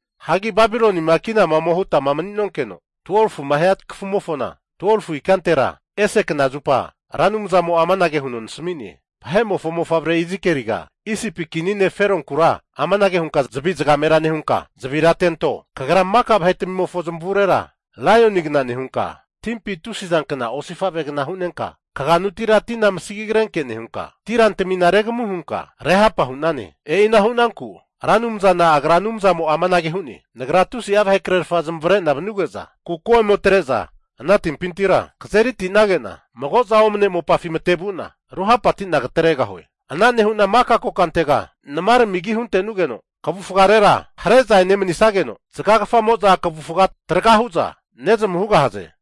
Hagi Babilonima kinama ome hutama mani'nonkeno, 12fuma hia kafumofona 12fu ikantera, ese knazupa Ra Anumzamo'a amanage huno nasami'ne. Vahe'mofo mofavre Izikieliga, Isipi kini ne' Feronkura amanage hunka zavi zagamera nehunka zavira atento, Kagra maka vahetamimofo zamavurera laionigna nehunka, timpi tusi zankna osifavegna hunenka kaganutira tina amasagi agrenke nehunka, ti rantintamina regamu hunka rehapa hu'nane. E'ina hunanku Ra Anumzana Agra Anumzamo'a amanage hu'ne, Nagra tusi'a vahekrerfa zamavare'na vanuge'za, kuko ome atre'za ana timpintira kazerite'nagena, mago'za omane mopafi matevu'na ruhapati'na katregahue. Ana nehu'na maka kokantega namarami agi huntenugeno kavufagarera hare'za enemanisageno, zagagafamo'za kavufaga traga hu'za nezamu hugahaze.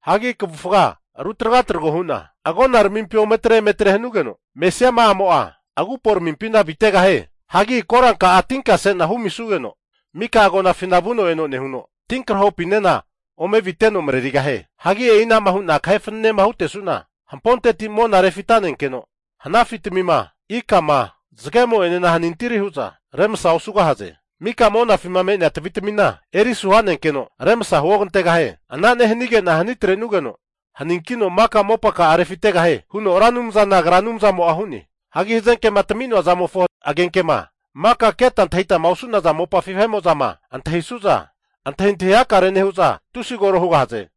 Hagi kavufaga ru tragatrago hu'na agonaramimpi ometre emetre hanugeno mesiama'amo'a aguporamimpina avitegahie. Hagi koranka'a tinkase'na humisugeno mika agonafina vuno eno nehuno, tinkrahopinena ome aviteno marerigahie. Hagi e'inama hu'na kahe fananema hutesu'na, hamponteti mona refita'nenkeno hanafitamima, ikama, zagemo'enena hanintiri hu'za remasa osugahaze. Mika monafima me'nea tavitamina eri asu ha'nenkeno, remasa huogantegahie. Ana nehanige'na hani atrenugeno haninkino maka mopaka'a refitegahie huno Ra Anumzana Agra Anumzamo'a hu'ne. Hagi hazenkema tami'noa zamofo agenkema maka keta antahitama osu'naza mopafi vahe'mo'zama antahisu'za, antahintahi hakare nehu'za tusi koro hugahaze.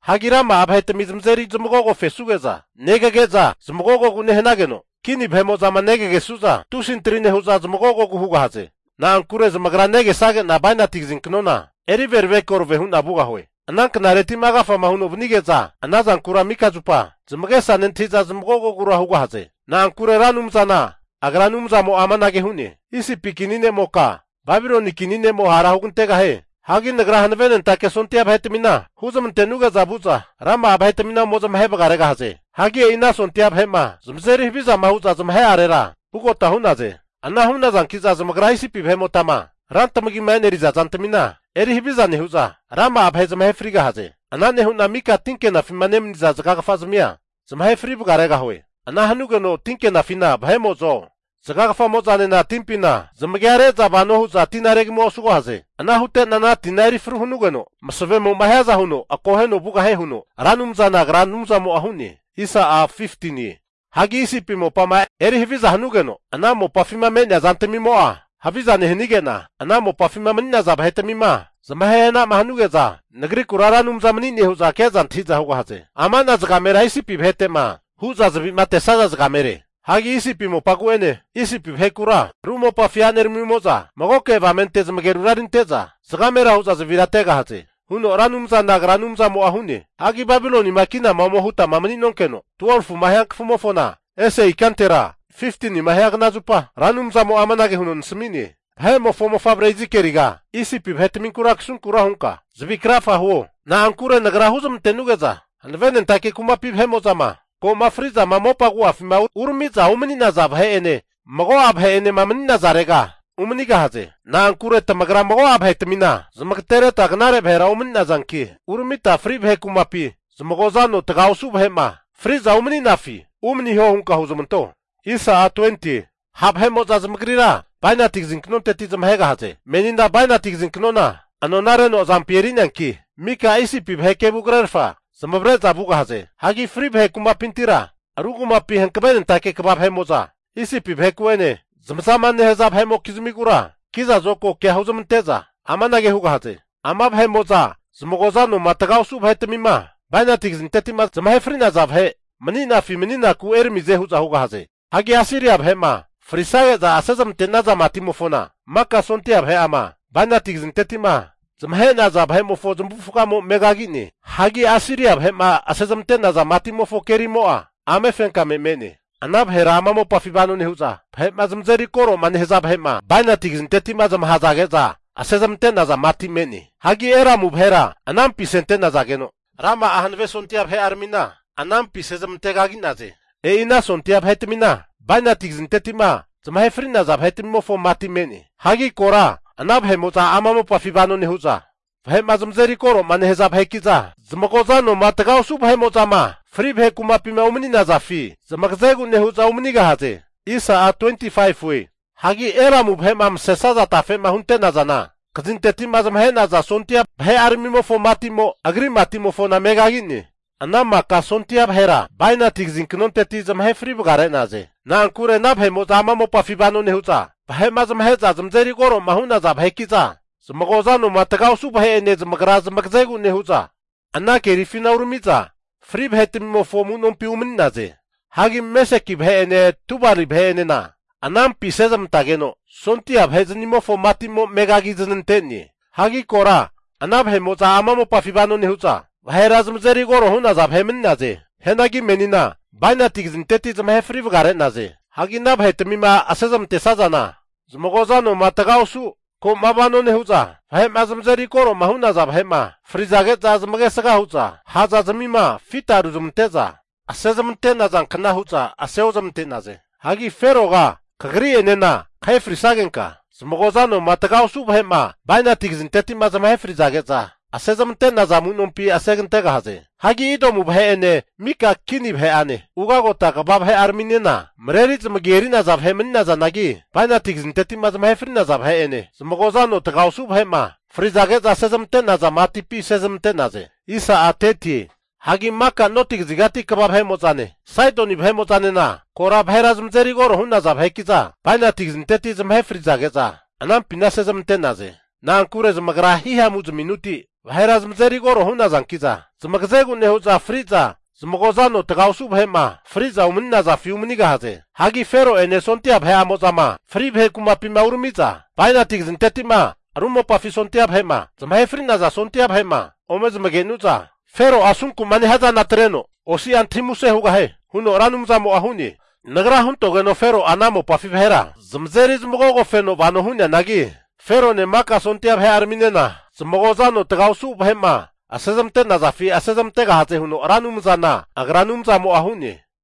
Hagi rama'a vahetami zamazeri zamagogofesuge'za negage'za zamagogogu nehanageno, kini vahe'mo'zama negagesu'za tusi antri nehu'za zamagogogu hugahaze. Na'ankure zamagra negesage'na bainati kazinknona eri verave korave huna vugahue. Ana knareti'ma agafama huno vanige'za, ana zankura mika zupa zamagesa nentahi'za zamagogogura hugahaze. Na'ankure Ra Anumzana Agra Anumzamo'a amanage hu'ne, Isipi kini ne'moka, Babiloni kini ne'mo hara hugantegahie! Hagi Nagra hanavenentake sondia vahetamina huzmante'nuge'za vu'za rama'a vahetmina ome zamahe vagaregahaze. Hagi e'ina sondia vahe'mo'za, vahe'ma zamazeri havizama hu'za zamahe'arera vugota hu'naze. Ana hu'nazanki'za zamagra Isipi vahe'motama rantamagima eneriza zantamina eri haviza nehu'za, rama'a vahe zamahe frigahaze. Ana nehu'na mika tinke'nafima nemaniza zagagafazmia zamahe fri vagaregahue. Ana hanugeno tinke'nafina vahe'mo'zo zagagafamo'zanena timpina zamagia re'za vano hu'za tina regamua osugahaze. Ana hute'na ana tina eri fru hanugeno masavemo'ma hiaza huno akoheno vugahie huno Ra Anumzana Agra Anumzamo'a hu'ne. Isipi mopama eri haviza hanugeno, ana mopafima me'nea zantmimo'a haviza nehanige'na, ana mopafima mani'naza vahetamima zamahe hana'ma hanuge'za, Nagrikura Ra Anumza mani'ne hu'za keza antahiza hugahaze. Amana zagamera Isipi vaheteku'ma hu'za zavima atesaza zagamere. Hagi Isipi mopagu'ene Isipi vahekura ru mopafi a'neramimo'za magoke avamente zamagerura erinte'za zagamera hu'za zavira ategahaze huno Ra Anumzana Agra Anumzamo'a hu'ne. Hagi Babilonima kinama ome hutama mani'nonkeno, 12fuma hia kafumofona ese ikantera, 15nima hia knazupa Ra Anumzamo'a amanage huno nasami'ne. Vahe'mofo mofavre Izikieliga, Isipi vahetaminkura kasunkura hunka zavi krafa huo. Na'ankure nagra huzmantenuge'za hanavenentake kumapi vahe'mo'zama ko'ma fri'zama mopa agu'afi urami'za umani'naza vahe'ene mago'a vahe'enema mani'nazarega umanigahaze. Na'ankure tamagra mago'a vahetamina zamagatereta knare vahera omani'nazanki, uramita fri vahe kumapi zamagoza ano taga osu vahe'ma fri'za umani'nafi umaniho hunka huzmanto. Ha' vahe'mo'za zamagrira bainati kazinknonteti zamahegahaze. Menina bainati kazinknona anona reno azampi eri'neanki, mika Isipi vahe kevu krerfa zamavare'za vugahaze. Hagi fri vahe kumapintira, ru kumapi hankavenentake kva vahe'mo'za Isipi vaheku'ene zamazama nehaza vahe'mokizmigura kiza zokago kea huzmante'za amanage hugahaze, ama vahe'mo'za zamagoza anoma taga osu vahetamima bainati kazinteti'ma zamahe fri'naza vahe mani'nafi mani'naku eramize hu'za hugahaze. Hagi Asiria vahe'ma frizage'za asezmante'naza matimofona, maka sondia vahe'ama bainati kazinteti'ma zamahe'naza vahe'mofo zamavufagamo megagi'ne. Hagi Asiria vahe'ma asezmante'naza matimofo kerimo'a ame fenkame me'ne. Ana vahera ama mopafima vano nehu'za, vahe'ma zamazeri koroma nehaza vahe'ma bainati kazinteti'ma zamahazage'za asezmante'naza mati me'ne. Hagi Elamu vahera anampi asente'nazageno, rama'a hanave sondia vahe'aramina anampi asezmante kagi'naze. E'i ana sondia vahetamina bainati kazinteti'ma zamahe fri'naza vahetamimofo mati me'ne. Hagi kora ana vahe'mo'za ama mopafima vanoma nehu'za, vahe'ma zamazeri koro'ma nehaza vaheki'za, zamagoza anoma taga osu vahe'mo'zama fri vahe kumapima umani'nafi zamagazegu nehu'za umanigahaze. Hagi Elamu vahe'ma masesaza tafema hunte'nazana, kazinteti'ma zamahe'naza sondia vahe'aramimofo mati'mo agri mati'mofona megagi'ne. Ana maka sondia vahera bainati kazinknonteti zamahe fri vagare'naze. Na'ankure ana vahe'mo'za ama mopafi vano nehu'za, vahe'ma zamahe'za zamazeri koroma hu'naza vahekiza zamagoza anoma taga osu vahe'ene zamagra zamagazegu nehu'za ana kerifina uramiza fri vahetamimofo amu'nompi umani'naze. Hagi Meseki vahe'ene Tubali vahe'enena anampi asezmantageno, sondia vahe'zanimofo matimo megagi'zanante'ne. Hagi kora ana vahe'mo'za ama mopafima vano nehu'za, vahera zamazeri koro hu'naza vahe mani'naze. Hianagi menina bainati kazinteti zamahe fri vagare'naze. Hagi ana vahetamima asezmantesazana, zamagoza anoma taga osu ko'ma vano nehu'za vahe'ma zamazeri koro'ma hu'naza vahe'ma frizage'za zamagesaga hu'za ha'zazmima fita ruzmante'za asezmante'naza kna hu'za ase ozmante'naze. Hagi Feroga kagri'enena kahe frisagenka, zamagoza anoma taga osu vahe'ma bainati kazinteti'ma zamahe frizage'za asezmante'naza amunompi asegantegahaze. Hagi Edomu vahe'ene mika kini vahe'ane, ugagota kva vahe'araminena mareri zamagi eri'naza vahe mani'nazanagi, bainati kazinteti'ma zamahe fri'naza vahe'ene, zamagoza ano taga osu vahe'ma frizage'za asezmante'naza matipi asezmante'naze. Hagi maka noti kazigati kva vahe'mo'zane Saidoni vahe'mo'zanena kora vahera zamazeri koro hu'naza vaheki'za, bainati kazinteti zamahe frizage'za anampina asezmante'naze. Na'ankure zamagra hihamu zaminuti vahera zamazeri koro hu'nazankiza, zamagazegu nehu'za fri'za zamagoza ano taga osu vahe'ma fri'za umani'nazafi umani'naze. Hagi Fero'ene sondia vahe'amo'zama fri vahe kumapima uramiza, bainati kazinteti'ma ru mopafi sondia vahe'ma zamahe fri'naza sondia vahe'ma ome zamagenu'za Fero'a asunku'ma nehia zana atreno osi'a antahi muse hugahie. Huno Ra Anumzamo'a hu'ne. Nagra huntogeno Fero'a ama mopafi vahera zamazeri zamagogofeno vano hu'neanagi, Ferone maka sondia vahe'araminena zamagoza ano taga osu vahe'ma asezmante'nazafi asezmantegahaze huno Ra Anumzana Agra Anumzamo'a hu'ne.